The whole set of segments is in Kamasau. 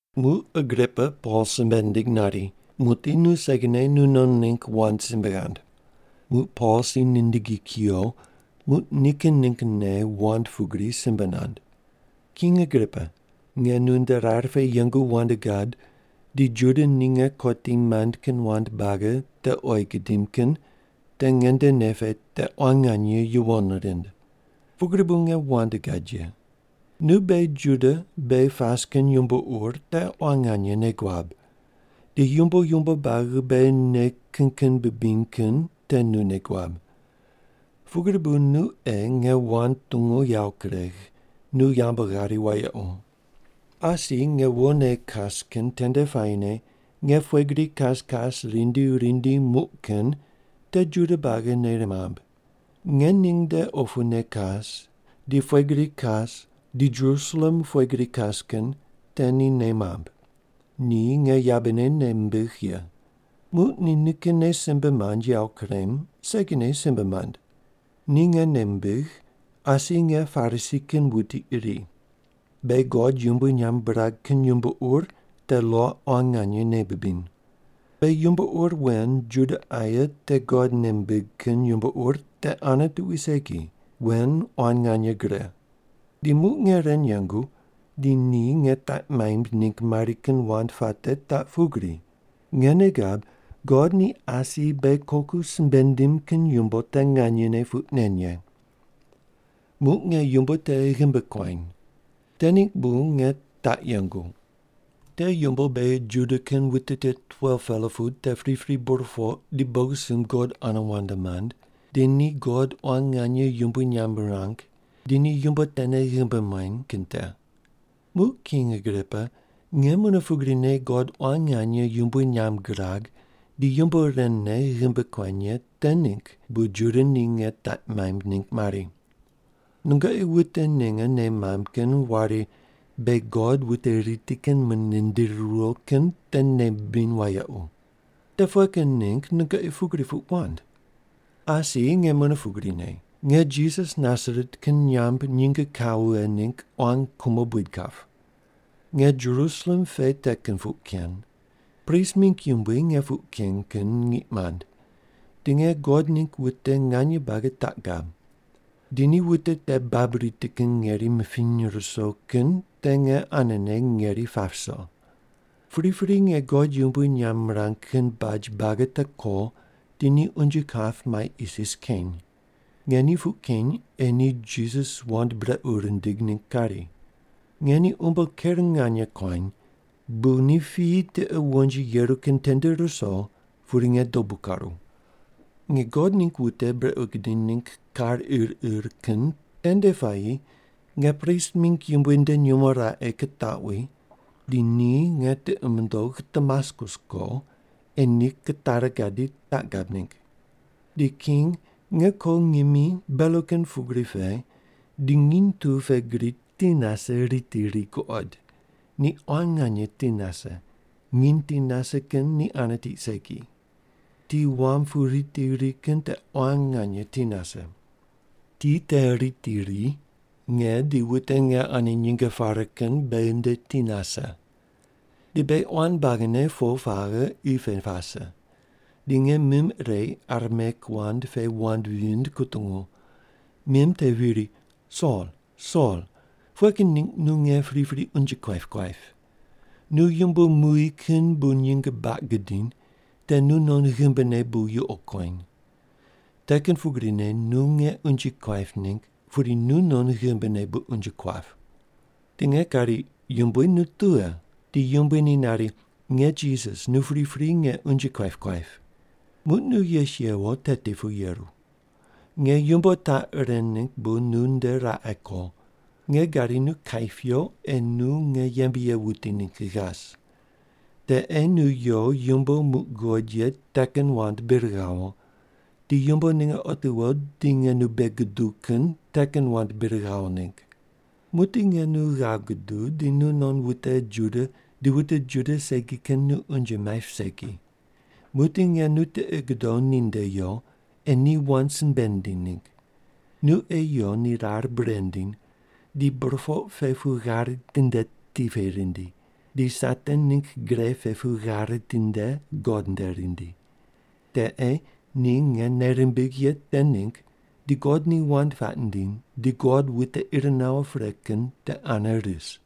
Muq Agripa Pol simbe nindig nari, “Muqdi nu segine nu non ningg wand simbe ghand.” Muq Pol si nindigi kuyo, muq ni nikin ninggne wand pugri simbe nand: “King Agripa. Nge nu nde rar pe yengu wand gad di Juda ni nge kotim maind kin wand buagi te oyi gidim kin te nge nde nei pe te quan nganye yuwon rind. Pugri bu nge wand gad ye. Nu beghi Juda beghi pas kin yumbo ur te quan nganye nei guab, di yumbo yumbo buagi beghi nei kin kin bibiny kin te nu nei guab. Pugri bu nu ei nge wand tungu yawo kuregh, nu yambu ghari wayequ. “Asi nge wone kas kin tende puayine nge pughe gri kas kas rindi rindi muq kin te Juda buagi ni nei mamb. Nge ning nde opune kas di pughe gri kas di Jerusalem pughe gri kas kin te ni nei mamb. Ni nge yabene nei mimbigh ye. Muq ni nikinne simbe mand yawo kurem, segine simbe mand. Ni nge nei mimbigh, asi nge Parisi kin wuti iri. Beghi God yumbui nyamb birag kin yumbo ur te lo quan nganye nei bibiny. Beghi yumbo ur wen Juda aye te God nei mimbig kin yumbo ur te ane tuqui segi, wen quan nganye gre. Di muq nge ren yengu, di ni nge taq maimb ningg mari kin wand puate taq pugri: Nge nei gab God ni asi beghi koku simbe nindim kin yumbo te nganye puq nen ye. Muq nge yumbo te ghimbi kuany. Te ningg bu nge taq yengu. Te yumbo beghi Juda kin wute tit 12-pela pu te pripri burpoq di bogisumb God ane wand mand, di ni God quan nganye yumbui nyamb mirang, di ni yumbo tene ghimbi muany kin te. Muq King Agripa, nge mune pugrine God quan nganye yumbui nyamb girag di yumbo ren ne ghimbi kuany ye te ningg bu Juda ni nge taq maimb ningg mari. Nungoqi wute ninge nei wamb kin wari beghi God wute riti kin mune nindiri riwo kin te nei bibiny wayequ. Te pughe kin ningg nungoqi pugri puq wand? “Asi nge mune pugrine, nge Jisas Nasaret kin nyamb nyinge kawo vighe ningg quan kumo buid kap. Nge Jerusalem pe te kin puq ken. Prist mingg yumbui nge puq ken kin ngiq mand, di nge God ningg wute nganye buagi taq gab. Di ni wute te babui riti kin ngeri mipiny ruso kin te nge anene ngeri pap ruso. Pripri nge God yumbui nyamb mirang kin baj buagi te ko, di ni unje kap mai isis keny. Nge ni puq keny ei ni Jisas wand brequ rindig ningg kari. Nge ni umbo ker nganye kuany, bu ni piyi tiqe wonji yeru kin tende ruso, pudi nge dobu karu. “Nge God ningg wute brequ gidiny ningg kar ir ir kin tende puayi nge prist mingg yumbui nde nyumo raqe kitaqwi, di ni nge tiqi mundogh Damaskus ko ei ni kitari gadi taq gab ningg. Di king, nge ko ngimi belo kin pugri pe di nginy tu pe gri ti nase riti ri guqod, ni quan nganye ti nase, nginy ti nase kin ni ane tiq segi. Ti wam pu riti ri kin te quan nganye ti nase. Ti te riti ri, nge di wute nge ane nyinge pare kin beghi nde ti nase. Di beghi quan buagine po paghe qi pe pase, di nge mim ire Arameik wand pe wand vind kutungu. Mim te viri, ‘Sol, Sol, pughe kin ningg nu nge pripri unje kuaip kuaip? Nu yumbo muy kin bu nyinge baq gudiny, te nunon ghimbine bu yuqo kueny. Te kin pugrine nu nge unje kuaip ningg, pudi nunon ghimbine bu unje kuap.’ “Di nge kari, ‘Yumbui, nu tughe?’ “Di Yumbui ni nari, ‘Nge Jisas, nu pripri nge unje kuaip kuaip. Muq nu yes yewo teti pu yeru. Nge yumbo taq ren ningg bu nu nde raqe ko: Nge gadi nu kaip yo ei nu nge yembe ye wuti ningg ghas. Te ei nu yo yumbo muq guqod ye te kin wand bir ghawo, di yumbo ninge otiwo di nge nu bei guduw kin te kin wand bir ghawo ningg. Muqdi nge nu ghav guduw di nunon wute Juda di wute Juda segi kin nu unje maip segi. Muqdi nge nu tiqi gudow ninde yo, ei ni wand simbe ndiny ningg. Nu ei yo ni rar bure ndiny, di burpoq pe pu ghare tinde ti pe rindi, di Satan ningg gre pe pu ghare tinde God nde rindi. Te ei ni nge nei rimbigh ye te ningg di God ni wand puaq nindiny di God wute ir nawo pre kin te ane ris.’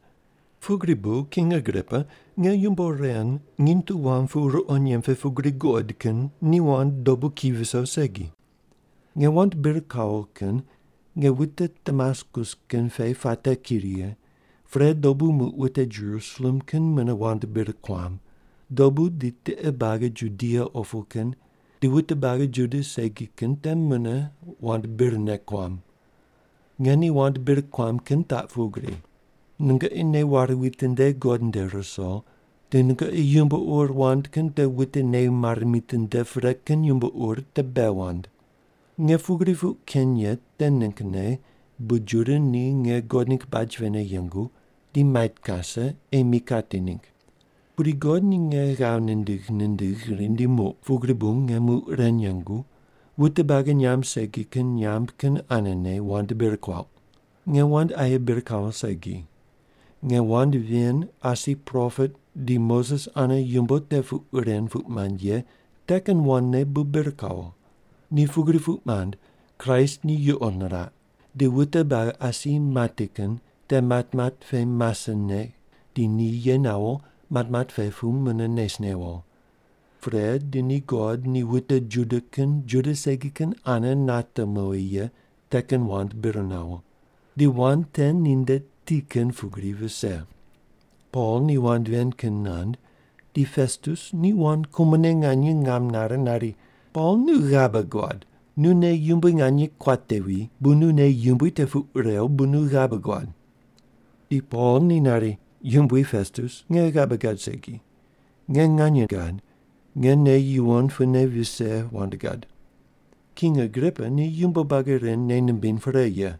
“Pugri bu, King Agripa, nge yumbo ren nginy tu wam pu ruqo nyemb pe pugri guqod kin ni wand dobu ki viso segi. Nge wand bir kawo kin nge wute Damaskus kin pe puate ki righe, pre dobu muq wute Jerusalem kin mune wand bir kuam, dobu di tiqe buagi Judia opu kin, di wute buagi Juda segi kin te mune wand birne kuam. Nge ni wand bir kuam kin taq pugri: ‘Nungoqi nei ware witinde God nde ruso, di nungoqi yumbo ur wand kin te wute nei mare mitinde pre kin yumbo ur te bei wand.’ Nge pugri puq ken ye te ninggne bu Juda ni nge God ningg baj pene yengu, di mait kase, ei mi kati ningg. Pudi God ni nge ghav nindigh nindigh rindi muq, pugri bu nge muq ren yengu, wute buagi nyamb segi kin nyamb kin anene wand bir kuauq. Nge wand aye bir kawo segi. Nge wand ven asi propet di Moses ane yumbo te puq ren puq mand ye te kin wandne bu bir kawo. Ni pugri puq mand, Kraist ni yuqo niraq, di wute buagi asi mati kin te matmat pe masene di ni ye nawo matmat pe pu mune nes newo. Pre, di ni God ni wute Juda kin Juda segi kin ane nate mowi ye te kin wand bir nawo. Di wand te ninde ti kin pugri vise.” Pol ni wand ven kin nand, di Pestus ni quan kumone nganye ngam nare nari, “Pol, nu ghabe guad! Nu nei yumbui nganye kuatevi, bu nu nei yumbui te puq rew bu nu ghabe guad!” Di Pol ni nari, “Yumbui Pestus, nge ghabe gad segi. Nge nganye gad, nge nei yuwon pune vise wand gad. King Agripa ni yumbo buagi ren nei nimbiny pre ye.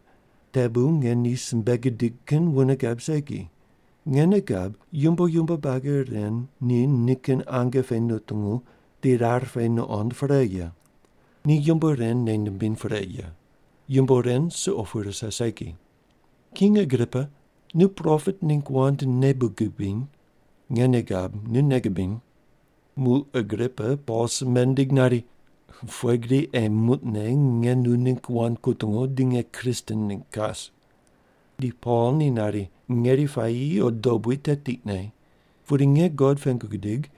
Te bu nge ni simbe gidig kin wune gab segi. Nge nei gab, yumbo yumbo buagi ren ni nikin ange pe nutungu di rar pe nuqond pre ye. Ni yumbo ren nei nimbiny pre ye. Yumbo ren suqo pu rise segi. King Agripa, nu propet ningg wand nei bu gubiny? Nge nei gab, nu nei gubiny!” Muq Agripa Pol simbe nindig nari, “Pughe gri ei muqne nge nu ningg wand kutungu di nge Kristen ningg kas?” Di Pol ni nari, “Ngeri puayi o dobui te tiqne. Pudi nge God pengu gidig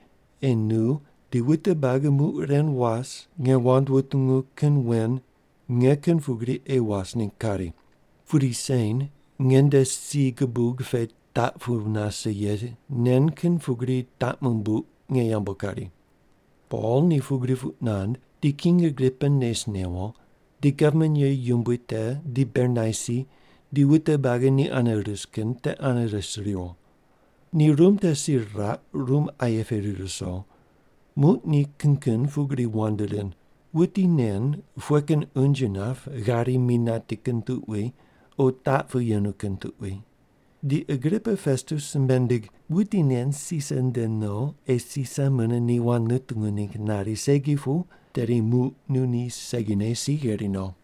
ei nu di wute buagi muq ren was nge wand wutungu kin wen nge kin pugri ei was ningg kari. Pudi sen nge nde si gubuq pe taq pu nase ye nen kin pugri taq mumbuq nge yambu kari.” Pol ni pugri puq nand, di King Agripa nes newo, di gavman ye yumbui te di Bernaisi di wute buagi ni ane ris kin te ane res riwo. Ni rum te si riraq, rum aye pe rir ruso, muq ni kin kin pugri wand rind, “Wuti nen pughe kin unje nap ghari mi nati kin tuqui, o taq pu yenu kin tuqui.” Di Agripa Pestus simbe nindig, “Wuti nen Sisar nde no ei Sisar mune ni wand nutungu ningg nari segi pu, tedi muq nu ni segine si gheri no.”